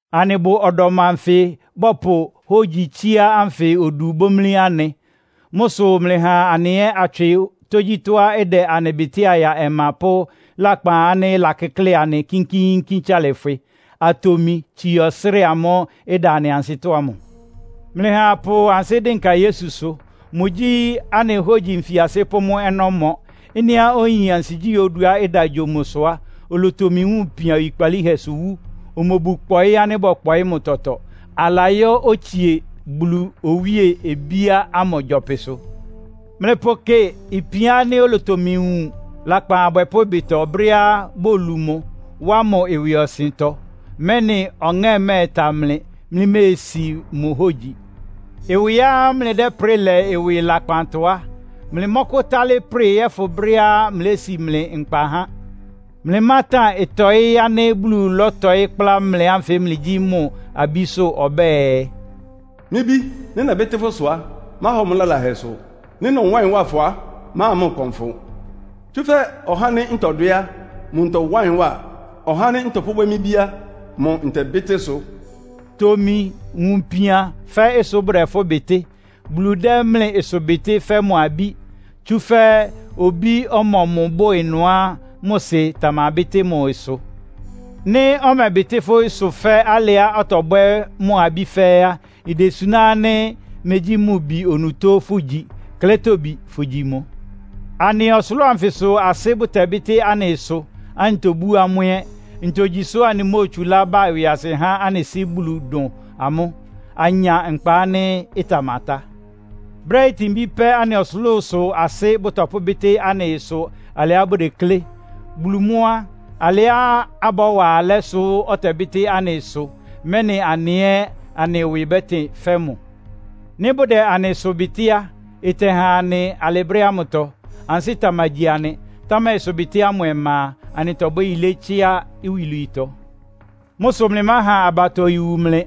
Anɩbʋ ɔdɔm anfɩ bɔpʋ hógyi tsíá ánfɩ odu bómlí anɩ. Mʋ́ sʋ mlɩha anɩ ɛ́ atswɩ tógyítɔ́á ɩdɛ anɩ bɩtɩ́a ya ɔma pʋ́ lakpan ánɩ́ ɩlakɩ́klɩ anɩ kínkíínkín tsalɩfwɩ, atomi tsii ɔsrɩ́ɩ amʋ́ʋ́ ɩda anɩ ansɩ́tɔ́ ámʋ. Mlɩha apʋ ansɩ́ dɩnka Yesusʋ. Mʋgyí anɩ hógyi nfiasɩ́ pʋ́ mʋ́ ɔnɔ́mɔ. Ɩ́nɩá oyin ansigyí oduá ɩda gyo mʋ sʋ á, olotomi wun ipian oyikpalíhɛsʋ wú. Omobu kpɔɩ́ ánɩ́ bɔ́kpɔɩ́ mʋ tɔtɔ, alayɔ́ otsie Bulu owíe obíá ámʋ gyɔpɩsʋ. Mlɩpʋkɩ ipian ánɩ́ olotomi wun lakpan abwɛpʋ́ ɩbɩtɔ, brɛ́á bolu mʋ, wá mʋ ɩwɩɔsɩntɔ, mɛ́nɩ ɔŋɛ́ mɛ́ɛta mlɩ, mlɩméesi mʋ hógyi. Ɩwɩá mlɩdɛ́prɩ lɛ ɩwɩ lakpantɔ á, mlɩmɔ́kʋ́tálɩ́ prɩ yɔ́fʋn brɛ́á mlési mlɩ nkpa há. Mlɩmátan ɩtɔ́ɩ ánɩ́ Bulu lɔ́tɔɩ́ kplá mlɩ ánfɩ mlɩgyí mʋ abísʋ́. Ɔbɛ́ɛ, “Mɩ́ bí, nɩ́ nɛbɩ́tɩ́ fʋ́ ɩsʋ á, máhɔ mʋ́ lalahɛ sʋ. Nɩ́ nɔwá ɩyɩn wa fʋ á, máha mʋ́ ɩkpɔn fʋ. Tsúfɛ́ ɔhá ánɩ́ ntɔdwɛ́ á, mʋ ntɔwá ɩyɩn wa. Ɔhá ánɩ́ nɔpʋ́bwɛ́ mɩ́ bí á, mʋ ntɛbɩ́tɩ́ ɩsʋ.” Tomi wun ipian fɛ́ ɩsʋ bʋdɛ fʋ́ bɩtɩ́. Bulu dɛ́ mlɩ ɩsʋbɩtɩ́ fɛ́ mʋ abí. Tsúfɛ́ obí ɔmɔmʋ bʋ ɩnʋá mʋ sɩ tamabɩ́tɩ́ mʋ ɩsʋ? Nɩ́ ɔmɛbɩtɩ́ fʋ́ ɩsʋ fɛ́ alɩá ɔtɔbwɛ́ mʋ abí fɛ́ɛ́ á, idesuná ánɩ́ megyí mʋ bi onutó fʋ́gyi, klɛ́tobi fʋgyi mʋ. Anɩ ɔsʋlʋ́ʋ anfɩsʋ asɩ́ bʋtɛbɩ́tɩ́ anɩ ɩsʋ, anɩtobú amʋ́ ɛ́. Ntogyi sʋ́ anɩmóotsulá ba ɩwɩasɩ há anɩ Sɩ́ Bulu dʋn amʋ́, anya nkpa ánɩ́ ɩtamatá? Brɛ́ itinbí pɛ́ anɩ ɔsʋlʋ́sʋ asɩ́ bʋtɔpʋ́bɩ́tɩ́ anɩ ɩsʋ alɩá bʋdeklé. Bulu mʋ́ á, alɩá abɔ́wa alɛ́ sʋ ɔtɛbɩ́tɩ́ anɩ ɩsʋ, mɛ́nɩ anɩ ɛ́ anɩ ɩwɩ bɛ́tɩn fɛ́ mʋ. Nɩ́ bʋdɛ anɩ ɩsʋ bɩtɩ́ á, ɩtɛhan anɩ alɩ brɛ́ ámʋtɔ. Ansɩ́ tamagyi anɩ. Támɛ ɩsʋbɩtɩ́ ámʋ ɔma a, anɩtɔbwɛ́ yilé, tsíá iwilwiitɔ. Mʋ́ sʋ mlɩmáha abatɔ iwu mlɩ,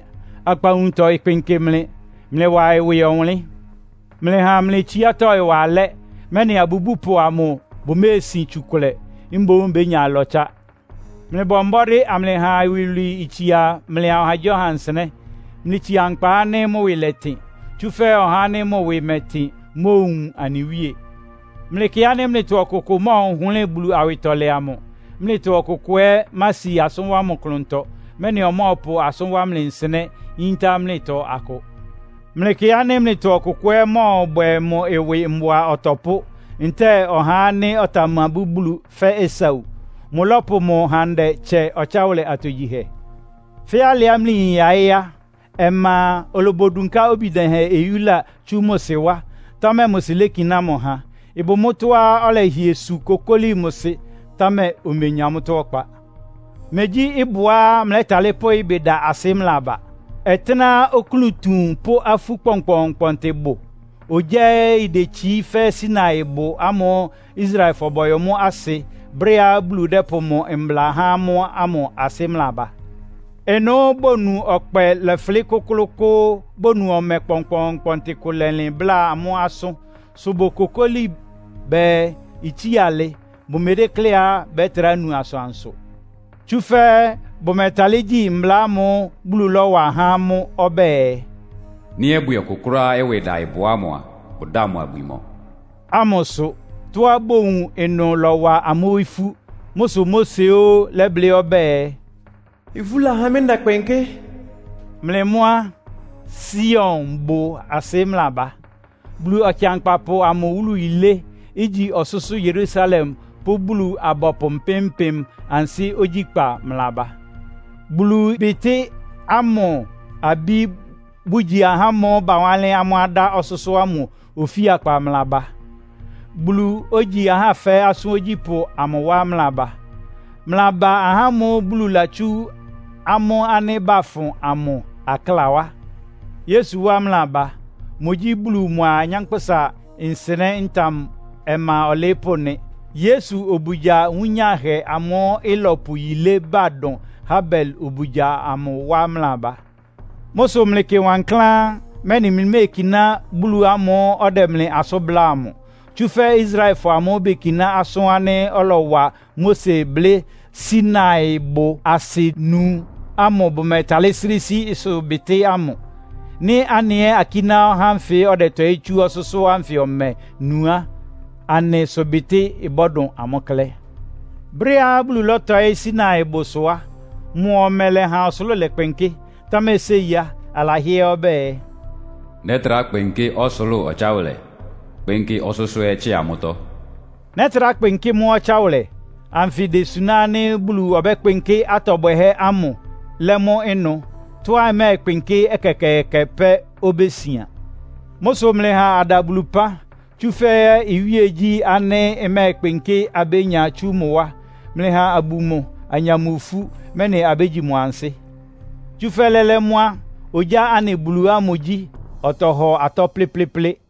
akpawunutɔ ɩkpɩnkɩ mlɩ. Mlɩwa ɩwɩ ɔwʋnlɩ́n! Mlɩha mlɩ tsiátɔ́ ɩwa alɛ́, mɛ́nɩ abubúpʋ amʋ bʋméesin tsukʋlɛ, mboún bénya ɩlɔtsá. Mlɩbɔ mbɔ́dɩ́ amlɩha iwilwii itsia mlɩa ɔhagyíɔha nsɩnɛ́. Mlɩtsia nkpa ánɩ́ mʋ́ ɩwɩ lɛtɩn, tsúfɛ́ ɔhá ánɩ́ mʋ ɩwɩ mɛ́tɩn móowun anɩ Wíe. Mlɩkɩ ánɩ́ mlɩtɔ ɔkʋkʋʋkʋ mɔ́ɔhʋlɩ́ɩ Bulu awɩtɔlɛ amʋ. Mlɩtɔ ɔkʋkʋ ɛ́ mási asʋ́n wá mʋ klʋntɔ, mɛ́nɩ ɔmɔ́ɔpʋ asʋ́n wá mlɩ nsɩnɛ́, iyinta mlɩtɔ akʋ. Mlɩkɩ ánɩ́ mlɩtɔ ɔkʋkʋ ɛ́ mɔ́ɔbwɛ mʋ ɩwɩ mbʋa ɔtɔpʋ́, ntɛ́ɛ ɔhá ánɩ́ ɔtamabú Bulu fɛ́ Esau. Mʋlɔ́pʋ mʋ handɛ tsɛ ɔtsáwʋlɛ atogyihɛ. Fɛ́ alɩá mlɩyin yaɩ́ á, ɔma a, olobodunká obi dɛhɛn oyúla tsú mʋ sɩ wá, támɛ mʋ sɩ lékiná mʋ ha. Ɩbʋ mʋ́tɔ́á ɔlɛhɩɛ su kokóli mʋ sɩ, támɛ omenya mʋ́tɔ́ ɔkpa. Megyí ɩbʋá mlɛ́talɩ́ pʋ ɩbɩ da asɩ mlɩlaba. Ɔtɩ́nɛ́á oklún tuun pʋ́ afú kpɔnkpɔɔnkpɔntɩ bʋ, ogyá ɛ́ idetsií fɛ́ Sinaibʋ ámʋ́ʋ́ Israelfɔ bɔyɔ mʋ́ asɩ brɛ́á Bulu dɛ́pʋ mʋ mbla há amʋ́ ámʋ asɩ mlɩlaba. Ɩnʋ́ bonu ɔkpɛ lɔfʋlɩ́ kʋ́klʋ́ʋ́kʋ́ʋ́, bonu ɔmɛ kpɔnkpɔɔnkpɔntɩ kʋ lɛlɩn bláa amʋ́ asʋ́n, sʋ bokokóli bɛɛ itsía alɩ, bʋmedékléá bɛtrá nu asʋansʋ. Tsúfɛ́ bʋmɛtalɩ́ gyí mbla ámʋ́ʋ́ Bulu lɔ́wa há amʋ́ ɔbɛ́ɛ, “Nɩ́ ɔbwɩ ɔkʋ kʋ́ráá ɩwɩ ɩda ɩbʋ ámʋ a, bʋdáa mʋ abwi mɔ” ámʋsʋ. Tɔ́á bowun ɩnʋ lɔ́wa amʋ́ ifú. Mʋ́ sʋ Mose óó lɛ́blɩ́ ɔbɛ́ɛ, “Ifú lahá mɩ́ ndɛkpɩnkɩ́!” Mlɩ mʋ́ á, Sionbʋ asɩ mlɩlaba. Bulu Ɔkɩankpapʋ amʋ wúlu yilé, igyi ɔsʋ́sʋ́ Yerusalem pʋ́ Bulu-abɔpʋ mpɩ́m-mpɩ́m ansɩ́ ogyíkpa mlɩlaba. Bulu bitɩ́ ámʋ abí, bʋgyi ahá ámʋ́ʋ́ bawánlɩ́n amʋ́ adá ɔsʋ́sʋ́ ámʋ ofíakpa mlɩlaba. Bulu, ogyi ahá fɛ́ɛ́ asʋ́n ogyípʋ́ amʋ wá mlɩlaba. Mlɩlaba ahá ámʋ́ʋ́ Bulu latsú amʋ́ ánɩ́ bafʋn amʋ akláa wá. Yesu wá mlɩlaba. Mʋgyí Bulu mʋa anyánkpʋ́sa nsɩnɛ́ ntam ɔma ɔlɩɩ́pʋ́ nɩ. Yesu obugya wúnyáhɛ amʋ́ʋ́ ɩlɔpʋ yilé ba dʋn Habel obugya amʋ wá mlɩlaba. Mʋ́ sʋ mlɩkɩ wankláán, mɛ́nɩ mlɩméekiná Bulu ámʋ́ʋ́ ɔdɛ mlɩ asʋ́n bláa amʋ. Tsúfɛ́ Israelfɔ ámʋ́ʋ́ bekiná asʋ́n ánɩ́ ɔlɔwa Mose blɩ́ Sinaibʋ asɩ nu ámʋ bʋmɛtalɩ́ srɩ́ sí ɩsʋbɩtɩ́ ámʋ. Nɩ́ anɩ ɛ́ akíná ɔhá ánfɩ ɔdɛtɔɩ́ tsú ɔsʋ́sʋ́ ánfɩ ɔmɛ nu á, anɩ ɩsʋbɩtɩ́ bɔ́dʋn amʋ́ klɛ́. Brɛ́á Bulu lɔ́tɔɩ́ Sinaibʋsʋ á, mʋ ɔmɛ lɛ́ha ɔsʋlʋ́ʋ lɛkpɩnkɩ́. Támɛ séi á, alahɩ́ɛ́ ɔbɛ́ɛ, “Nɛ́trá kpɩnkɩ́ ɔsʋlʋ́ʋ ɔtsáwʋlɛ, kpɩ́nkɩ́ ɔsʋ́sʋ́ ɛ́ tsɩ́a mʋ́tɔ́.” “Nɛ́trá kpɩnkɩ́ mʋ́ ɔtsáwʋlɛ” anfɩ idesuná ánɩ́ Bulu ɔbɛ́kpɩnkɩ́ atɔ bwɛhɛ́ ámʋ, lɛ́ mʋ́ ɩnʋ. Tɔ́á ɩmɛ́ɛkpɩnkɩ́ ɛkɛkɛɛkɛ pɛ́ obésian. Mʋ́ sʋ mlɩha ada Bulu ɩpán. Tsúfɛ́ iwíegyí ánɩ́ ɩmɛ́ɛkpɩnkɩ́ abénya tsú mʋ wá. Mlɩha abu mʋ, anya mʋ ifú, mɛ́nɩ abégyi mʋ ansɩ́. Tsúfɛ́ lɛ́lɛ́ mʋ́ á, ogyá anɩ Bulu ámʋ gyí, ɔtɔhɔ atɔ́ plɩ́plɩ́plɩ́plɩ́.